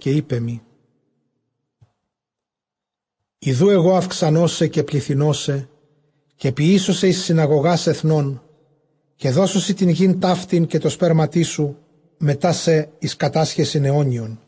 καὶ εἶπέ μοι, ἰδοὺ ἐγὼ αὐξανῶ σε, καὶ πληθυνῶ σε, καὶ ποιήσω σε εἰς συναγωγὰς ἐθνῶν· καὶ δώσω σοι τὴν γῆν ταύτην, καὶ τῷ σπέρματί σου μετὰ σὲ, εἰς κατάσχεσιν αἰώνιον.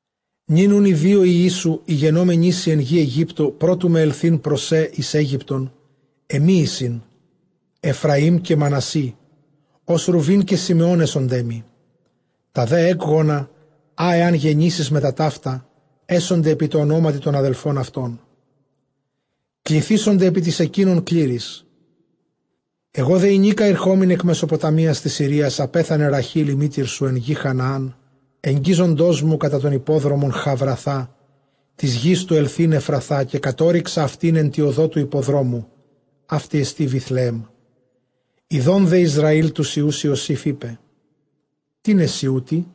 Νῦν οὖν οἱ δύο υἱοί σου, οἱ γενόμενοί σοι ἐν γῇ Αἰγύπτῳ πρὸ τοῦ με ἐλθεῖν πρός σε εἰς Αἴγυπτον, ἐμοί εἰσιν, Ἐφραὶμ καὶ Μανασσῆ· ὡς Ῥουβὴν καὶ Συμεὼν ἔσονταί μοι. Τὰ δὲ ἔκγονα, ἃ ἐὰν γεννήσῃς μετὰ ταῦτα, ἔσονται ἐπὶ τῷ ὀνόματι τῶν ἀδελφῶν αὐτῶν· κληθήσονται ἐπὶ τοῖς ἐκείνων κλήροις. Ἐγὼ δὲ ἡνίκα ἠρχόμην ἐκ Μεσοποταμίας τῆς Συρίας, ἀπέθανε Ῥαχὴλ ἡ μήτηρ σου ἐν γῇ Χαναὰν, ἐγγίζοντός μου κατὰ τὸν ἱππόδρομον Χαβραθὰ τῆς γῆς, τοῦ ἐλθεῖν Ἐφραθά· καὶ κατώρυξα αὐτὴν ἐν τῇ ὁδῷ τοῦ ἱπποδρόμου· αὕτη ἐστὶ Βηθλεέμ. Ἰδὼν δὲ Ἰσραὴλ τοὺς υἱοὺς Ἰωσὴφ, εἶπε, τίνες σοι οὗτοι;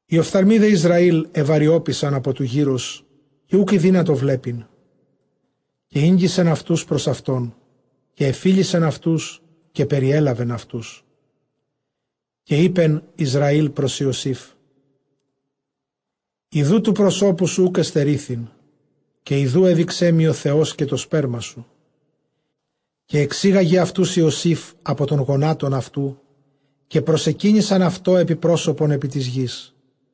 Οἱ ὀφθαλμοὶ δὲ Ἰσραὴλ ἐβαρυώπησαν ἀπὸ τοῦ γήρως, καὶ οὐκ ἠδύνατο βλέπειν· καὶ ἤγγισεν αὐτοὺς πρὸς αὐτὸν, καὶ ἐφίλησεν αὐτοὺς, καὶ περιέλαβεν αὐτους. Καὶ εἶπεν Ἰσραὴλ πρὸς Ἰωσὴφ, ἰδοὺ τοῦ προσώπου σου οὐκ ἐστερήθην, καὶ ἰδοὺ ἔδειξέ μοι ὁ Θεὸς καὶ τὸ σπέρμα σου. Καὶ ἐξήγαγεν αὐτοὺς Ἰωσὴφ ἀπὸ τῶν γονάτων αὐτοῦ· καὶ προσεκύνησαν αὐτῷ ἐπὶ πρόσωπον ἐπὶ τῆς γῆς.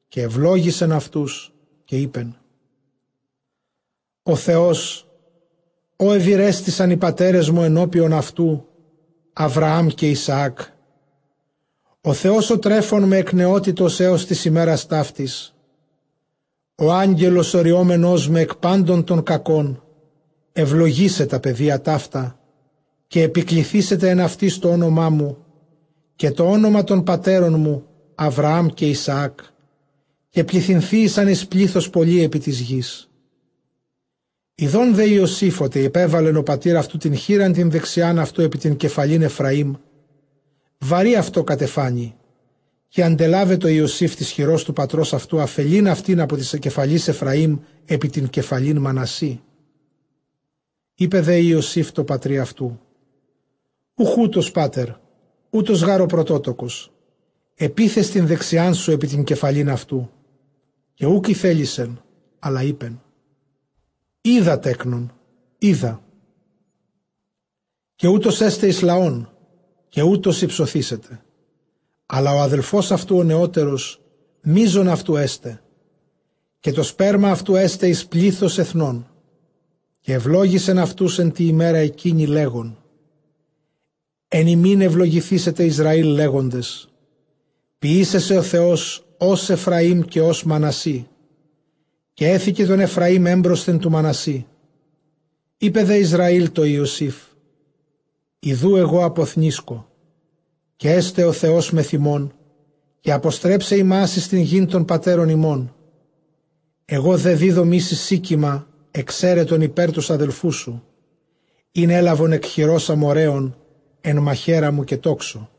Καὶ εὐλόγησεν αὐτοὺς, καὶ εἶπεν, ὁ Θεὸς, ᾧ εὐηρέστησαν οἱ πατέρες μου ἐνώπιον αὐτοῦ, Ἁβραὰμ καὶ Ἰσαὰκ, ὁ Θεὸς ὁ τρέφων με ἐκ νεότητος ἕως τῆς ἡμέρας ταύτης, ὁ Ἄγγελος ὁ ῥυόμενός με ἐκ πάντων τῶν κακῶν, εὐλογήσαι τὰ παιδία ταῦτα· καὶ ἐπικληθήσεται ἐν αὐτοις τὸ ὄνομά μου, καὶ τὸ ὄνομα τῶν πατέρων μου Ἁβραὰμ καὶ Ἰσαάκ· καὶ πληθυνθείησαν εἰς πλῆθος πολὺ ἐπὶ τῆς γῆς. Ἰδὼν δὲ Ἰωσὴφ ὅτι ἐπέβαλεν ὁ πατὴρ αὐτοῦ τὴν χεῖρα τὴν δεξιὰν αὐτοῦ ἐπὶ τὴν κεφαλὴν Ἐφραὶμ, βαρὺ αὐτῷ κατεφάνη· καὶ ἀντελάβετο Ἰωσὴφ τῆς χειρὸς τοῦ πατρὸς αὐτοῦ, ἀφελεῖν αὐτὴν ἀπὸ τῆς κεφαλῆς Ἐφραὶμ ἐπὶ τὴν κεφαλὴν Μανασσῆ. Εἶπε δὲ Ἰωσὴφ τῷ πατρὶ αὐτοῦ, οὐχ οὕτως, πατὴρ, οὗτος γὰρ ὁ πρωτότοκος· ἐπίθες τὴν δεξιάν σου ἐπὶ τὴν κεφαλὴν αὐτοῦ. Καὶ οὐκ ἠθέλησεν, ἀλλʼ εἶπεν, οἶδα, τέκνον, οἶδα· καὶ οὗτος ἔσται εἰς λαὸν, καὶ οὗτος ὑψωθήσεται· ἀλλʼ ὁ ἀδελφὸς αὐτοῦ ὁ νεώτερος μείζον αὐτοῦ ἔσται, καὶ τὸ σπέρμα αὐτοῦ ἔσται εἰς πλῆθος ἐθνῶν. Καὶ εὐλόγησεν αὐτοὺς ἐν τῇ ἡμέρᾳ ἐκείνῃ, λέγων, ἐν ὑμῖν εὐλογηθήσεται Ἰσραὴλ, λέγοντες, ποιήσαι σε ὁ Θεὸς ὡς Ἐφραὶμ καὶ ὡς Μανασσῆ· καὶ ἔθηκε τὸν Ἐφραὶμ ἔμπροσθεν τοῦ Μανασσῆ. Εἶπε δὲ Ἰσραὴλ τῷ Ἰωσὴφ, ἰδοὺ ἐγὼ ἀποθνήσκω· καὶ ἔσται ὁ Θεὸς μεθʼ ὑμῶν, καὶ ἀποστρέψει ὑμᾶς εἰς τὴν γῆν τῶν πατέρων ὑμῶν. Ἐγὼ δὲ δίδωμί σοι Σίκιμα ἐξαίρετον ὑπὲρ τοὺς ἀδελφούς σου, ἣν ἔλαβον ἐκ χειρὸς Ἀμοῤῥαίων ἐν μαχαίρᾳ μου καὶ τόξῳ.